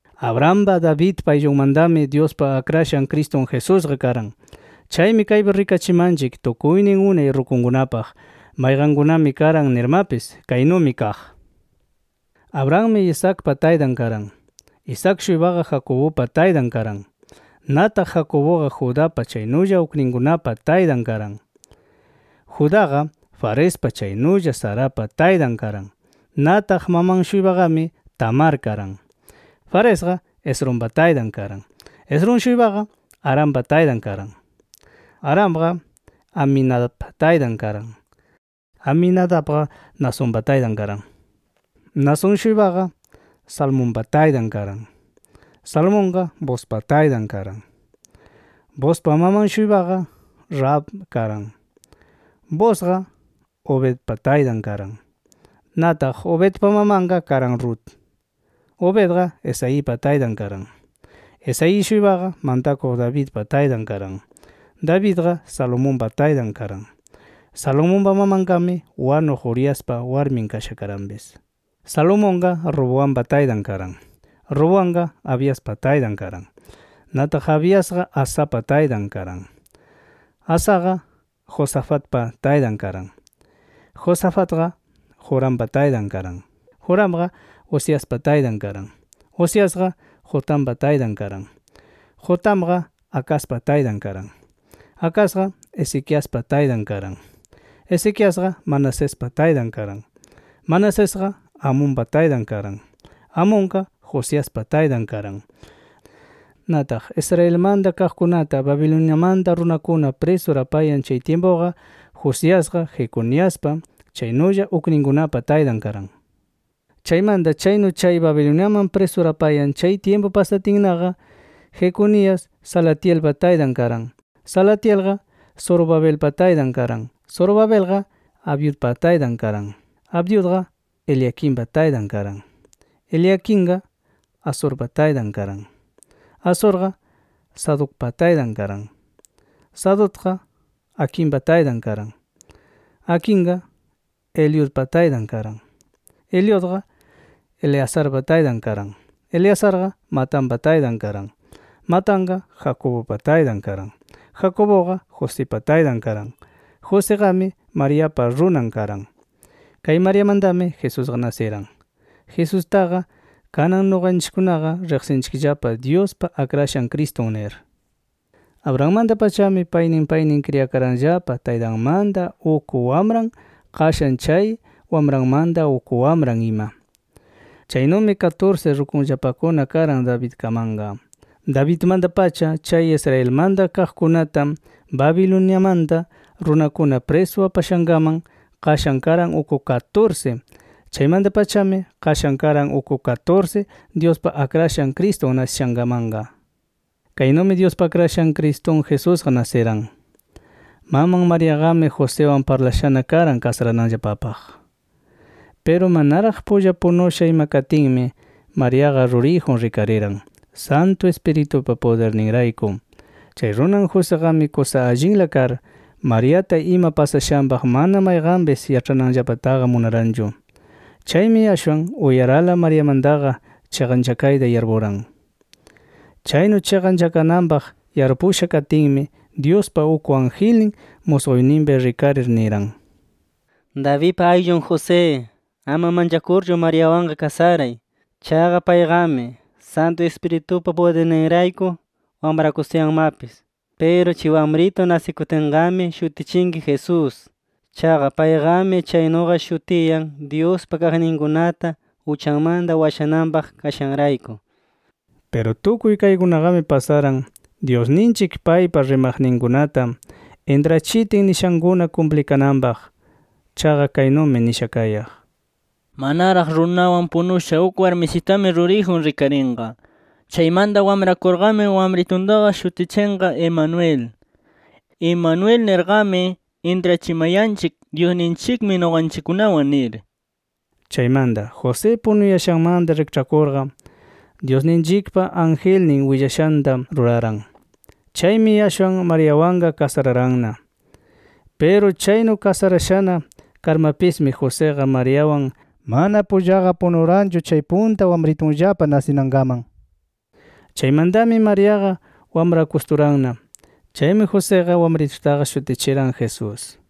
Abrahampa, Davidpa ayllunmantami Dyuspa Akrashan Cristun Jesusqa karan. Chaymi kaypi rikachimanchik tukuynin unay rukunkunapaq, mayqankunami karan nirmapis. Kaynumi kaq: Abrahammi Isaacpa taytan karan. Isaac-shuypaqa Jacobupa taytan karan. Nataq Jacobuqa Judapa, chaynulla ukninkunapa taytan karan. Judaqa, Farespa chaynulla Zarapa taytan karan. Nataq maman-shuypaqami Tamar karan. Faresqa Esrompa taytan karan. Esrom-shuypaqa Arampa taytan karan. Aramqa Aminadabpa taytan karan. Aminadabqa Naasonpa taytan karan. Naasón-shuypaqa Salmonpa taytan karan. Salmonqa Boozpa taytan karan. Boozpa maman-shuypaqa Rahab karan. Boozqa Obedpa taytan karan. Nataq Obedpa mamanqa karan Rut. Obedqa Isaipa taytan karan. Isaí-shuypaqa mantakuq Davidpa taytan karan. Davidqa Salomonpa taytan karan. Salomonpa mamanqami wanuq Uriaspa warmin kasha karanpis. Salomonqa Roboampa taytan karan. Roboamqa Abiaspa taytan karan. Nataq Abiasqa Asapa taytan karan. Asaqa Josafatpa taytan karan. Josafatqa Jorampa taytan karan. Joramqa Uziaspa taytan karan. Uziasqa Jotampa taytan karan. Jotamqa Acazpa taytan karan. Acazqa Ezequiaspa taytan karan. Ezequiasqa Manasespa taytan karan. Manasesqa Amonpa taytan karan. Amonqa Josiaspa taytan karan. Nataq Israelmanta kaqkunata Babiloniamanta runakuna prisur apayan chay tyimpuqa Josiasqa Jeconiaspa, chaynulla ukninkunapa taytan karan. Chaymanta chaynu chay Babiloniaman prisur apayan chay tyimpu pasatinnaqa, Jeconias Salatielpa taytan karan. Salatielqa Zorobabelpa taytan karan. Zorobabelqa Abiudpa taytan karan. Abiudqa Eliaquimpa taytan karan. Eliaquimqa Azorpa taytan karan. Azorqa Sadocpa taytan karan. Sadocqa Aquimpa taytan karan. Aquimqa Eliudpa taytan karan. Eliudqa Eleazarpa taytan karan. Eleazarqa Matanpa taytan karan. Matanqa Jacobupa taytan karan. Jacobuqa Josipa taytan karan. Josiqami Mariapa runan karan. Kay Mariamantami Jesusqa nasiran. Jesustaqa, kanan nuqanchikkunaqa riqsinchikllapa Dyuspa Akrashan Cristun nir. Abrahammanta-pachami paynin paynin kriyakaranllapa taytanmanta uk wamran, qashan chay wamranmanta uk wamran ima. Chaynumi katursi rukunllapakuna karan Davidkamanqa. Davidmanta-pacha chay Israelmanta kaqkunata Babiloniamanta runakuna prisu apashankaman, qashan karan uk katursi. Chaymanta-pachami qashan karan uk katursi Dyuspa Akrashan Cristun nasishankamanqa. Kaynumi Dyuspa Akrashan Cristun Jesusqa nasiran. Maman Mariaqami Josiwan parlashana karan kasarananllapapaq. Piru manaraq pulla punusha ima katinmi, Mariaqa ruriyjun rikariran Santu Ispiritupa pudirninrayku. Chay runan Josiqami kusa allinla kar, Mariata ima pasashanpaq mana mayqanpis yaĉhananllapataqa munaranchu. Chaymi ashwan uyarala Mariamantaqa chiqanchakayta yarpuran. Chaynu chiqanchakananpaq yarpusha katinmi, Dyuspa uk angelnin musquyninpi rikarir niran: “Davidpa ayllun José, ama manchakurchu Mariawanqa kasaray. Chaqa payqami Santu Ispiritupa pudirninrayku wamrakustuyanmapis. Piru chay wamritu nasikutinqami shutichinki Jesús. Chaqa payqami chaynuqa shutiyan Dyuspa kaqninkunata uchanmanta washananpaq kashanrayku”. Piru tukuy kaykunaqami pasaran Dyusninchik paypa rimaqninkunata intrachitin nishankuna kumplikananpaq. Chaqa kaynumi nisha kayaq: “Manaraq runawan punusha uk warmisitami ruriyjun rikarinqa. Chaymanta wamrakurqami wamrituntaqa shutichinqa Emanuel”. Emanuel nirqami intrachimayanchik: “Dyusninchikmi nuqanchikkunawan” nir. Chaymanta José punuyashanmanta rikĉhakurqa, Dyusninchikpa angelnin willashanta ruraran. Chaymi ashwan Mariawanqa kasararanna. Piru chaynu kasarashana karmapismi Josiqa Mariawan mana pullaqa punuranchu chay punta wamritunllapa nasinankaman. Chaymantami Mariaqa wamrakusturanna. Chaymi Josiqa wamritutaqa shutichiran Jesús.